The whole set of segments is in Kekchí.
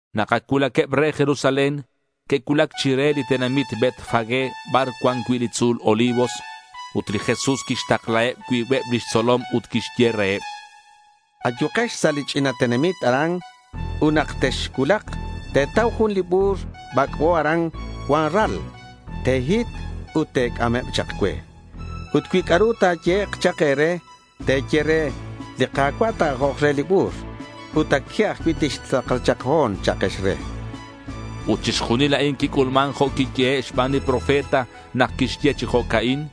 Nak ac cuulaqueb re Jerusalén, que'cuulac chire li tenamit Betfagé bar cuan cui' li tzu̱l Olivos. Ut li Jesús quixtaklaheb cuibeb lix tzolom ut quixye reheb: —Ayukex sa' li ch'ina tenamit a'an. Ut nak texcuulak, te̱tau jun li bu̱r bac'bo aran cuan ral. Te̱hit ut te̱c'ameb chak cue. Ut cui c'a'ru ta̱yehek' chak e̱re, te̱ye re, “Li Ka̱cua' ta̱ajok re li bu̱r ut a' que ajcui' tixtakla chak ho̱n”, cha'akex re. Ut chixjunil a'in quic'ulman jo' quiyehe' xban li profeta nak quixye chi jo'ca'in: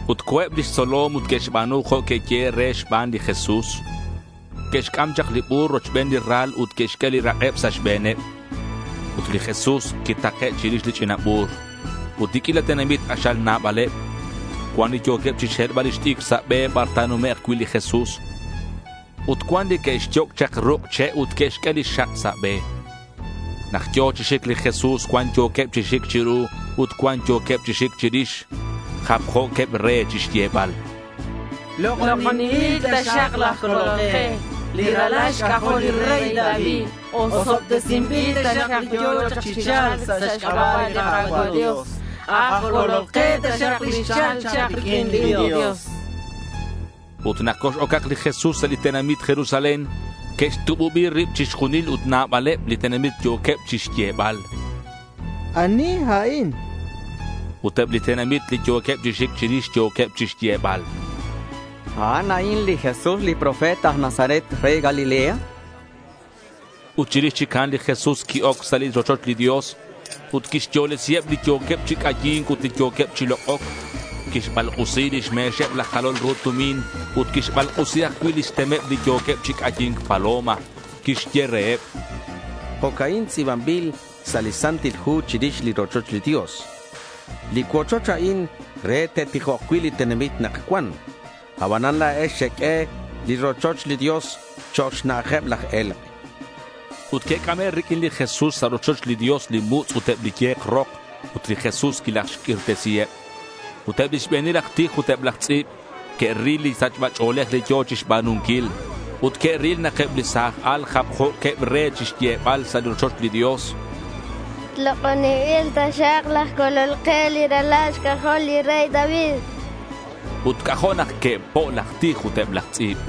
Ut co̱eb lix tzolom ut que'xba̱nu jo' que'yehe' reheb xban li Jesús. Que'xc'am chak li bu̱r rochben li ral ut que'xq'ue li rak'eb sa' xbe̱neb. Ut li Jesús quitake' chirix li ch'ina bu̱r. Ut li q'uila tenamit k'axal nabaleb. Cuan li yo̱queb chixhelbal lix t'icr sa' be bar ta̱numek' cui' li Jesús. Ut cuan li que'xyoc' chak ruk' che' ut que'xq'ue li xak sa' be. Nak yo̱ chi xic li Jesús cuan yo̱queb chi xic chiru ut cuan yo̱queb chi xic chirix. Japjo̱queb re chixyebal: —Lok'oninbil taxak laj Colol ke, li ralal xc'ajol li rey David. Osobtesinbil taxak li yo̱ chak chi cha̱lc sa' xc'aba' li Ka̱cua' Dios. Aj Colol ke taxak li xchal chak riq'uin li Dios, chanqueb. Ut nak cox-ocak li Jesús sa' li tenamit Jerusalén, que'xtububi rib chixjunil ut nabaleb li tenamit yo̱queb chixyebal: —¿Ani a'in? chanqueb. Ut eb li tenamit li yo̱queb chi xic chirix yo̱queb chixyebal: —A'an a'in li Jesús li profeta, aj Nazaret re Galilea, chanqueb. Ut chirix chic a'an li Jesús qui-oc sa' li rochoch li Dios ut quixyolesiheb li yo̱queb chi c'ayi̱nc ut li yo̱queb chi lok'oc. Quixbalk'usi lix me̱xeb laj jalol ru tumin ut quixbalk'usi ajcui' lix temeb li yo̱queb chi c'ayi̱nc paloma. Quixye reheb: —Jo'ca'in tz'i̱banbil sa' li Santil Hu chirix li rochoch li Dios: Li cuochoch a'in re te'tijok cui' li tenamit nak cuan. Abanan la̱ex xeq'ue li rochoch li Dios chok' xna'ajeb laj e̱lk', chan li Jesús reheb. Ut que'c'ame' riq'uin li Jesús sa' rochoch li Dios li mutz' ut eb li ye̱k rok ut li Jesús quilajxq'uirtesiheb. Ut eb lix be̱nil aj tij ut eb laj tz'i̱b que'ril li sachba ch'o̱lej li yo̱ chixba̱nunquil. Ut que'ril nak eb li sa̱j al japjo̱queb re chixyebal sa' li rochoch li Dios: —Lok'oninbil taxak laj Colol ke, li ralal xc'ajol li rey David, chanqueb. Ut c'ajo' nak que'po' laj tij ut eb laj tz'i̱b.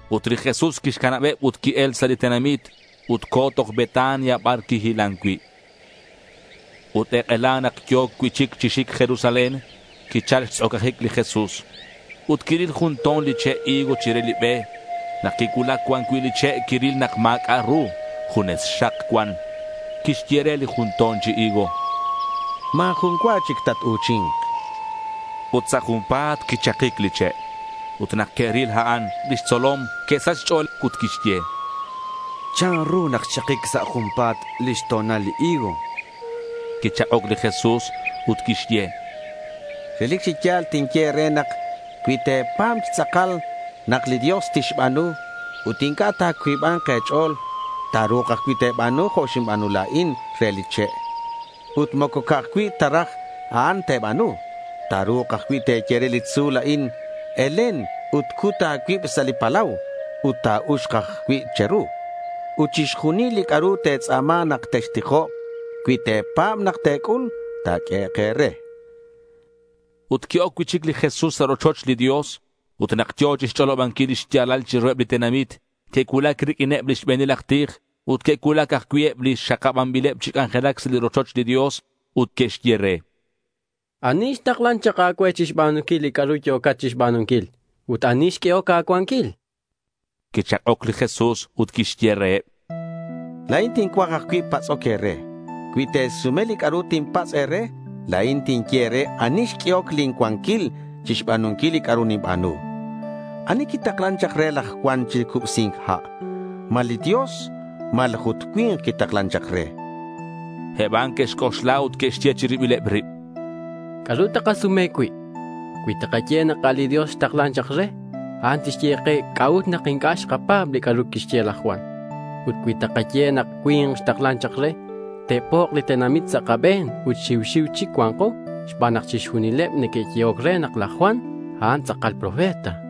Ut li Jesús quixcanabeb ut qui-el sa' li tenamit ut co̱ toj Betania bar quihilan cui'. Ut ek'ela nak yo̱ cui'chic chi xic Jerusalén, quichal xtz'ocajic li Jesús. Ut quiril jun to̱n li che' higo chire li be. Nak quicuulac cuan cui' li che' quiril nak ma̱c'a' ru. Junes xak cuan. Quixye re li jun to̱n chi higo: —Ma̱ jun cua chic tatu̱chi̱nk, chan. Ut sa' junpa̱t quichakic li che'. Ut nak que'ril a'an, lix tzolom que'sach xch'o̱l ut que'xye: —¿Chanru nak xchakic sa' junpa̱t lix to̱nal li higo? chanqueb. Quichak'oc li Jesús ut quixye: —Relic chi ya̱l tinye e̱re nak cui te̱pa̱b chi tz'akal nak li Dios tixba̱nu, ut inc'a' ta̱cuiba̱nk e̱ch'o̱l, ta̱ru̱k ajcui' te̱ba̱nu jo' xinba̱nu la̱in re li che'. Ut moco ca'aj cui' ta raj a'an te̱ba̱nu. Ta̱ru̱k ajcui' te̱ye re li tzu̱l a'in, “Elen ut cut a̱cuib sa' li palau” ut ta̱uxk ajcui' che̱ru. Ut chixjunil li c'a'ru te̱tz'a̱ma nak textijok, cui te̱pa̱b nak te̱c'ul, ta̱q'uehek' e̱re. Ut qui-oc cui'chic li Jesús sa' rochoch li Dios. Ut nak yo̱ chixch'olobanquil li xya̱lal chiruheb li tenamit, que'cuulac riq'uineb li xbe̱nil aj tij ut que'cuulac ajcui' eb li xakabanbileb chi c'anjelac sa' li rochoch li Dios. Ut que'xye re: —¿Ani xtaklan chak a̱cue chixba̱nunquil li c'a'ru yo̱cat chixba̱nunquil? Ut, ¿ani xq'uehoc a̱cuanquil?— Quichak'oc li Jesús ut quixye reheb: —La̱in tincuaj ajcui' patz'oc e̱re. Cui te̱sume li c'a'ru tinpatz' e̱re, la̱in tinye e̱re ani xq'uehoc lin cuanquil chixba̱nunquil li c'a'ru ninba̱nu. ¿Ani quitaklan chak re laj Juan chi cubsi̱nc ha'? ¿Ma li Dios malaj ut cui̱nk quitaklan re? chan reheb. Eb a'an que'xc'oxla ut que'xye chi ribileb rib: —¿C'a'ru takasume cui'? Cui takaye nak a' li Dios xtaklan chak re, a'an tixye ke c'a'ut nak inc'a' xkapa̱b li c'a'ru quixye laj Juan. Ut cui takaye nak cui̱nk xtaklan chak re, te'pok' li tenamit sa' kabe̱n ut xiu xiu chic cua̱nko xban nak chixjunileb neque'yehoc re nak laj Juan, a'an tz'akal profeta.—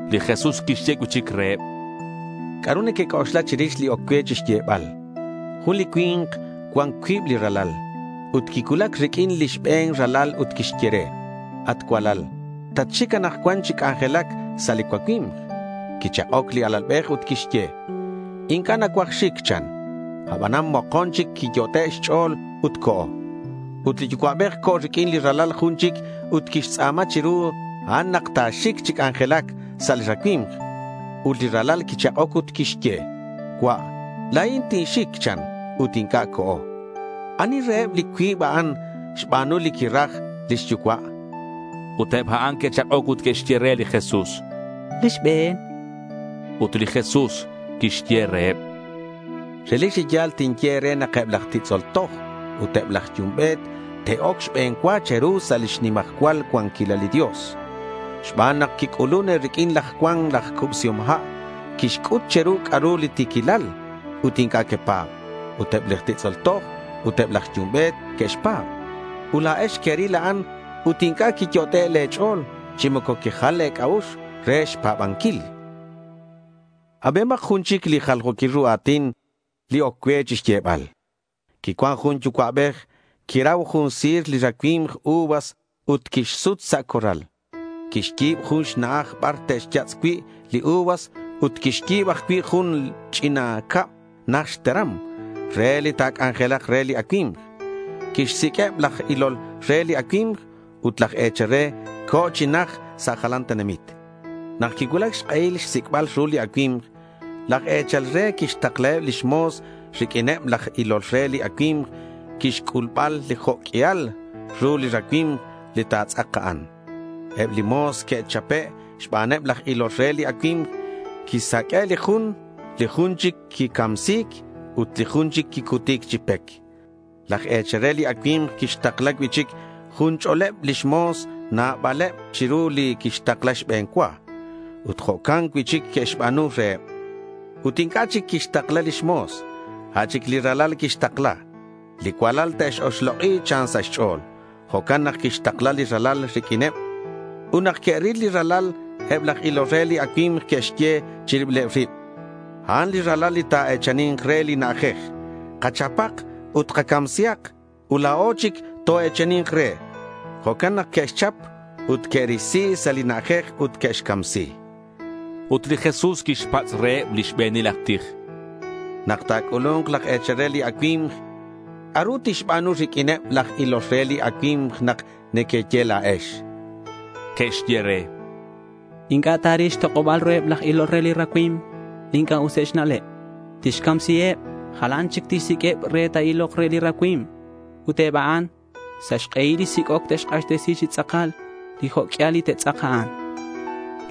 Li Jesús quixye cui'chic reheb: ¿C'a'ru nequec'oxla chirix li oc cue chixyebal? Jun li cui̱nk cuan cuib li ralal. Ut quicuulac riq'uin li xbe̱n ralal ut quixye: —At cualal, tatxic anakcuan chi c'anjelac sa' li cuacui̱mk.— Quichak'oc li alalbej ut quixye: —Inc'a' nacuaj xic, chan. Abanan mokon chic quiyot'e' xch'o̱l ut co̱. Ut li yucua'bej co̱ riq'uin li ralal jun chic ut quixtz'a̱ma chiru a'an nak ta̱xic chi c'anjelac sa' li racui̱mk. Ut li ralal quichak'oc ut quixye: —Cua', la̱in tinxic, chan. Ut inc'a' co̱. ¿Ani reheb li cuib a'an xba̱nun re li quiraj lix yucua'? chan. Eb a'an que'chak'oc ut que'xye: —Li xbe̱n.— Ut li Jesús quixye reheb: —Relic chi ya̱l tinye e̱re nak eb laj titz'ol toj ut eb laj yumbe̱t te'oc xbe̱n cua che̱ru sa' lix nimajcual cuanquilal li Dios. Xban nak quic'ulun e̱riq'uin laj Juan laj Cubsihom Ha'. Quixc'ut che̱ru c'a'ru li ti̱quilal ut inc'a' quepa̱b. Ut eb laj titz'ol toj ut eb laj yumbe̱t que'xpa̱b. Ut la̱ex queril a'an ut inc'a' quiyot'e' le̱ ch'o̱l chi moco quejal le̱ c'a'ux re xpa̱banquil, chan. Abihomak jun chic li jaljo̱quil ru a̱tin li oc cue xyebal: Quicuan jun yucua'bej. Quirau jun si̱r li racui̱mk uvas ut quixsut sa' corral. Quixyi̱b jun xna'aj bar te'xyatz' cui' li uvas ut quixyi̱b ajcui' jun ch'ina cab najt xteram re li ta̱c'ac'ale̱nk re li acui̱mk. Quixsiq'ueb laj ilol re li racui̱mk. Ut laj e̱chal re co̱ chi najt sa' jalan tenamit. Nak quicuulac xk'ehil xsic'bal ru li acui̱mk, laj e̱chal re quixtaklaheb lix mo̱s riq'uineb laj ilol re li acui̱mk chixc'ulbal li jo' q'uial ru li racui̱mk li ta̱tz'ak a'an. Eb li mo̱s que'chape' xbaneb laj ilol re li acui̱mk. Quisaq'ue' li jun, li jun chic quicamsi̱c, ut li jun chic quicuti̱c chi pec. Laj e̱chal re li acui̱mk quixtakla cui'chic jun ch'o̱leb lix mo̱s, nabaleb chiru li quixtakla xbe̱n cua. Ut jo'can cui'chic que'xba̱nu reheb. Ut inc'a' chic quixtakla lix mo̱s. A' chic li ralal quixtakla. “Li cualal te'x-oxlok'i” chan sa' xch'o̱l. Jo'can nak quixtakla li ralal riq'uineb. Ut nak que'ril li ralal, eb laj ilol re li acui̱mk que'xye chi ribileb rib, “A'an li ralal li ta̱e̱chani̱nk re li na'ajej. Kachapak ut kacamsihak, ut la̱o chic toe̱chani̱nk re.” Jo'can nak que'xchap. Ut que'risi sa' li na'ajej ut que'xcamsi. Ut li Jesús quixpatz' reheb li xbe̱nil aj tij: —Nak ta̱c'ulu̱nk laj e̱chal re li acui̱mk, ¿c'a'ru tixba̱nu riq'uineb laj ilol re li racui̱mk nak nequeye la̱ex?— Que'xye re: —Inc'a' ta̱ril xtok'oba̱l ruheb laj ilol re li racui̱mk li inc'a' useb xna'leb. Tixcamsiheb. Jalan chic tixsiq'ueb re te'ilok re li racui̱mk. Ut eb a'an, sa' xk'ehil li sic'oc, te'xk'axtesi chi tz'akal li jo' q'uial li ta̱tz'ak a'an, chanqueb.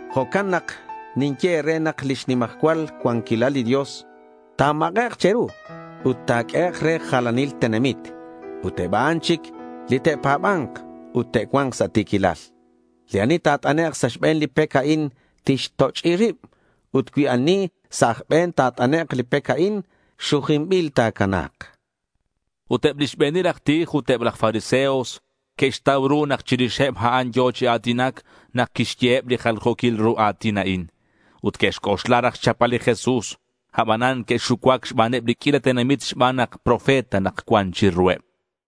Jo'can nak ninye e̱re nak lix nimajcual cuanquilal li Dios ta̱mak'ek' che̱ru ut ta̱q'uehek' re jalanil tenamit ut eb a'an chic li te'pa̱ba̱nk ut te'cua̱nk sa' ti̱quilal. Li ani ta̱t'anek' sa' xbe̱n li pec a'in tixtoch'i rib. Ut cui ani sa' aj be̱n ta̱t'anek' li pec a'in, xujinbil ta̱cana̱k, chan li Jesús. Ut eb lix be̱nil aj tij ut eb laj fariseos que'xtau ru nak chirixeb a'an yo̱ chi a̱tinac nak quixyeheb li jaljo̱quil ru a̱tin a'in. Ut que'xc'oxla raj xchapbal li Jesús, abanan que'xucuac xbaneb li q'uila tenamit xban nak profeta nak cuan chiruheb.